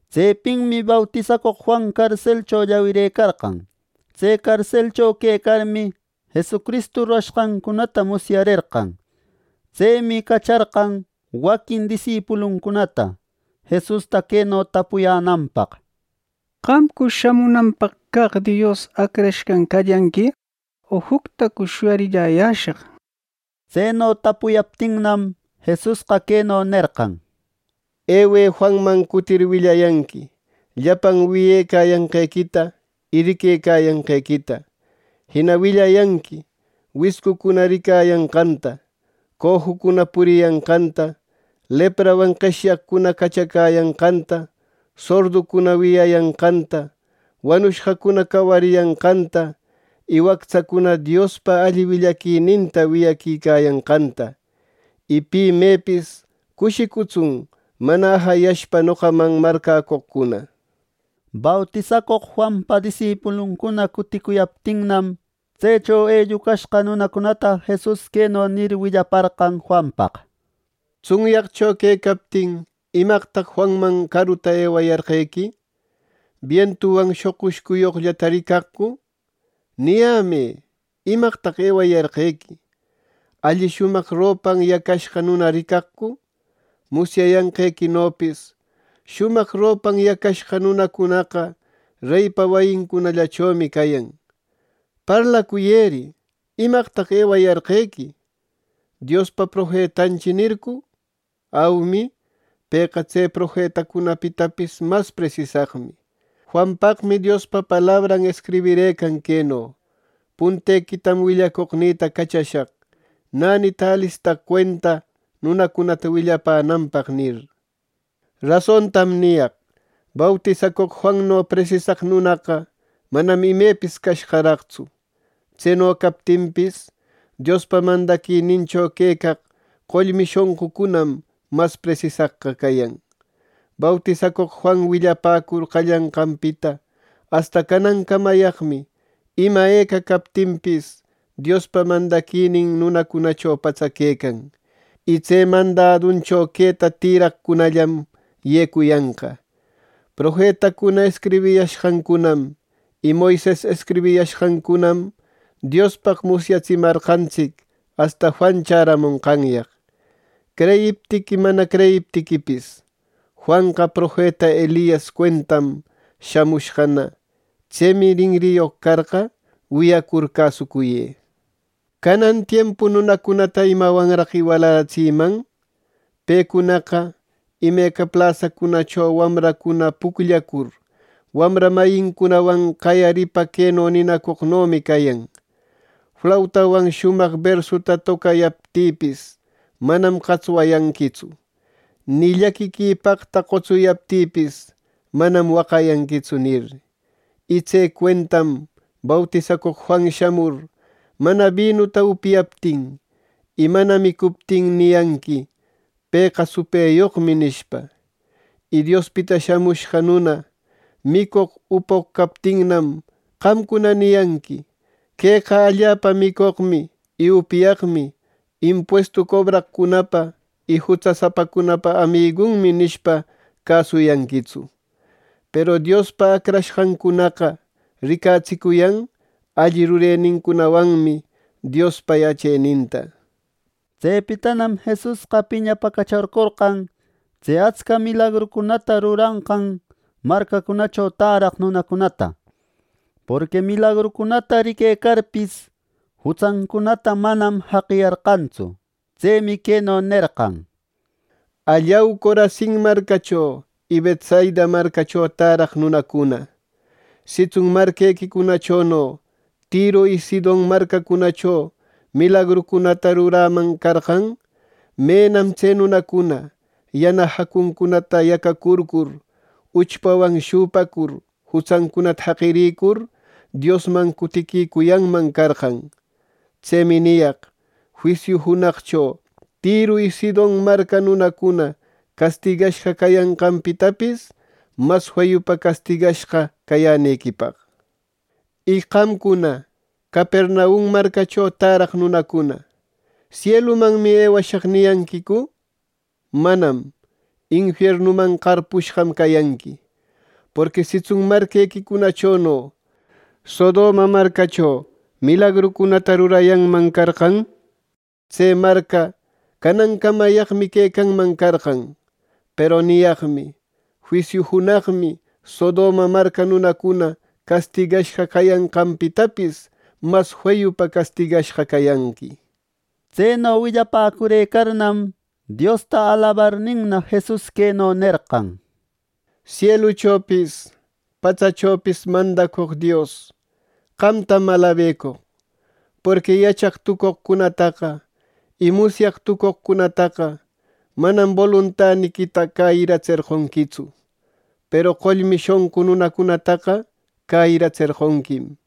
Tsepinmi bautisacoq Juan carselcho llawirëcarqan. Tse carselcho quecarmi Jesucristu rurashqancunata musyarerqan. Tsemi cacharqan waquin disipuluncunata, Jesusta queno tapuyänanpaq: —¿Qamcush shamunanpaq caq Dios Acrashqan callanqui, o juctacush shuyalläyäshaq? —nir. Tseno tapuyaptinnam, Jesusqa queno nerqan: —Ewë, Juanman cutir willayanqui llapan wiyecayanqequita y riquecayanqequita. Jina willayanqui: wiscucuna ricayanqanta, cojucuna puriyanqanta, leprawan qeshyaqcuna cachacäyanqanta, sorducuna wiyayanqanta, wanushqacuna cawariyanqanta y wactsacuna Diospa alli willaquininta wiyaquicayanqanta. Y pi mepis cushicutsun mana ajayashpa noqaman marcäcoqcuna —nir. Bautisacoq Juanpa disipuluncuna cuticuyaptinnam, tsecho ellucashqa nunacunata Jesus queno nir willaparqan Juanpaq: —Tsunyaqcho quecaptin, ¿Imaqtaq Juanman caruta ewayarqequi! ¿Bientuwan shoqush cuyoqllata ricaqcu! ¡Niyämë! ¿Imaqtaq ewayarqequi, alli shumaq ropan yacashqa nuna ricaraqcu! Musyayanqequinopis shumaq ropan yacashqa nunacunaqa reypa wayincunallachomi cayan. ¡Parlacuyëri! ¿Imaqtaq ewayarqequi! ¿Diospa profetanchi nircu? ¡Aumi! Pëqa tse profetacunapitapis mas presisaqmi. Juanpaqmi Diospa palabran escribirëcan queno: ‘Puntequitam willacoqnïta cachashaq, nänita alistaq cuenta nunacunata willapänanpaq’ nir. Rasontam niyaq: bautisacoq Juanno presisaq nunaqa manam imepis cashqaraqtsu. Tseno captinpis, Diospa mandaquinincho quecaq qollmi shonqucunam mas presisaqqa cayan. “Bautisacoq Juan willapäcur qallanqanpita asta canancamayaqmi ima eca captinpis Diospa mandaquinin nunacunacho patsaquecan; y tse mandaduncho queta tïraqcunallam yecuyanqa. Profetacuna escribiyashqancunam y Moises escribishqancunam Diospaq musyatsimarqantsic asta Juan chäramonqanyaq. Creyiptiqui mana creyiptiquipis, Juanqa profeta Elias cuentam shamushqana. ¡Tsemi rinriyoq carqa, wiyacur cäsucuyë!” “¿Canan tiempu nunacunata imawanraq iwalaratsiman? Pecunaqa imeca plasacunacho wamracuna pucllacur, wamra mayincunawan qayaripa queno ninacoqnomi cayan: ‘Flautawan shumaq bersuta tocayaptïpis, manam qatswayanquitsu; ni llaquiquipaqta qotsuyaptïpis, manam waqayanquitsu’ nir. Y tse cuentam bautisacoq Juan shamur, mana binuta upyaptin, y mana micuptin, niyanqui ‘Pëqa supëyoqmi’ nishpa. Y Diospita Shamushqa Nuna micoq upoq captinnam, qamcuna niyanqui: ‘Queqa allapa micoqmi y upyaqmi, impuestu cobraqcunapa y jutsasapacunapa amigunmi’ nishpa, cäsuyanquitsu. Peru Diospa acrashqancunaqa ricatsicuyan alli rurenincunawanmi Diospa yacheninta.” Tsepitanam Jesusqa piñapäcacharcorqan tse atsca milagrucunata ruranqan marcacunacho täraq nunacunata; porqui milagrucunata riquecarpis, jutsancunata manam jaqiyarqantsu. Tsemi queno nerqan: “¡Allau, Corasin marcacho y Betsaida marcacho täraq nunacuna! Sitsun marquequicunachono Tiro y Sidon marcacunacho milagrucunata ruräman carqan; menam tse nunacuna yana jacuncunata yacacurcur, uchpawan shüpacur, jutsancunata jaqirïcur Diosman cuticuyanman carqan. Tsemi niyaq: juisiu junaqcho Tiro y Sidon marca nunacuna castigashqa cayanqanpitapis, mas feyupa castigashqa cayänequipaq. Y qamcuna, Capernaum marcacho täraq nunacuna, ‘Sielumanmi ewayäshaq’ ¿niyanquicu? ¡Manam, infiernuman qarpushqam cayanqui! Porqui sitsun marquequicunachono Sodoma marcacho milagrucunata rurayanman carqan, tse marca canancamayaqmi quecanman carqan. Peru niyaqmi: Juisiu junaqmi Sodoma marca nunacuna castigashqa cayanqanpitapis mas feyupa castigashqa cayanqui.” Tseno willapäcurëcarnam, Diosta alabarninna Jesus queno nerqan: “Sieluchopis, patsachopis mandacoq Dios, ¡qamtam alabecoq! Porqui yachaq tucoqcunataqa y musyaq tucoqcunataqa manam boluntaniquita cäyiratserqonquitsu; peru qollmi shonqu nunacunataqa cäyiratserqonquim.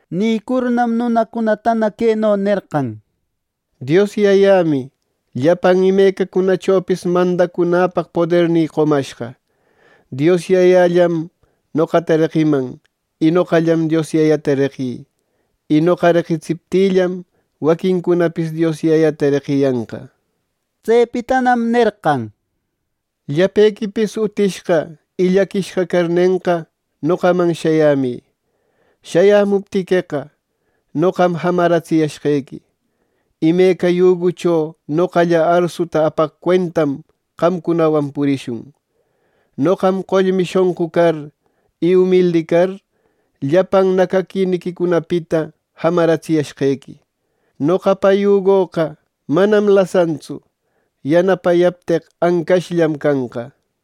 Nïcurnam, nunacunatana queno nerqan: “Dios Yayämi llapan imecacunachopis mandacunäpaq podernï qomashqa. Dios Yayallam noqata reqiman, y noqallam Dios Yayata reqï y noqa reqitsiptïllam waquincunapis Dios Yayata reqiyanqa.” Tsepitanam nerqan: “Llapequipis utishqa y llaquishqa carnenqa, noqaman shayämï. Shayämuptiqueqa, noqam jamaratsiyashqequi. Imeca yugucho noqalla arsuta apaq cuentam qamcunawan purishun. Noqam qollmi shonqu car y umildi car, llapan nacaquiniquicunapita jamaratsiyashqequi. Noqapa yugoqa manam lasantsu. Yanapayäpteq ancashllam canqa.”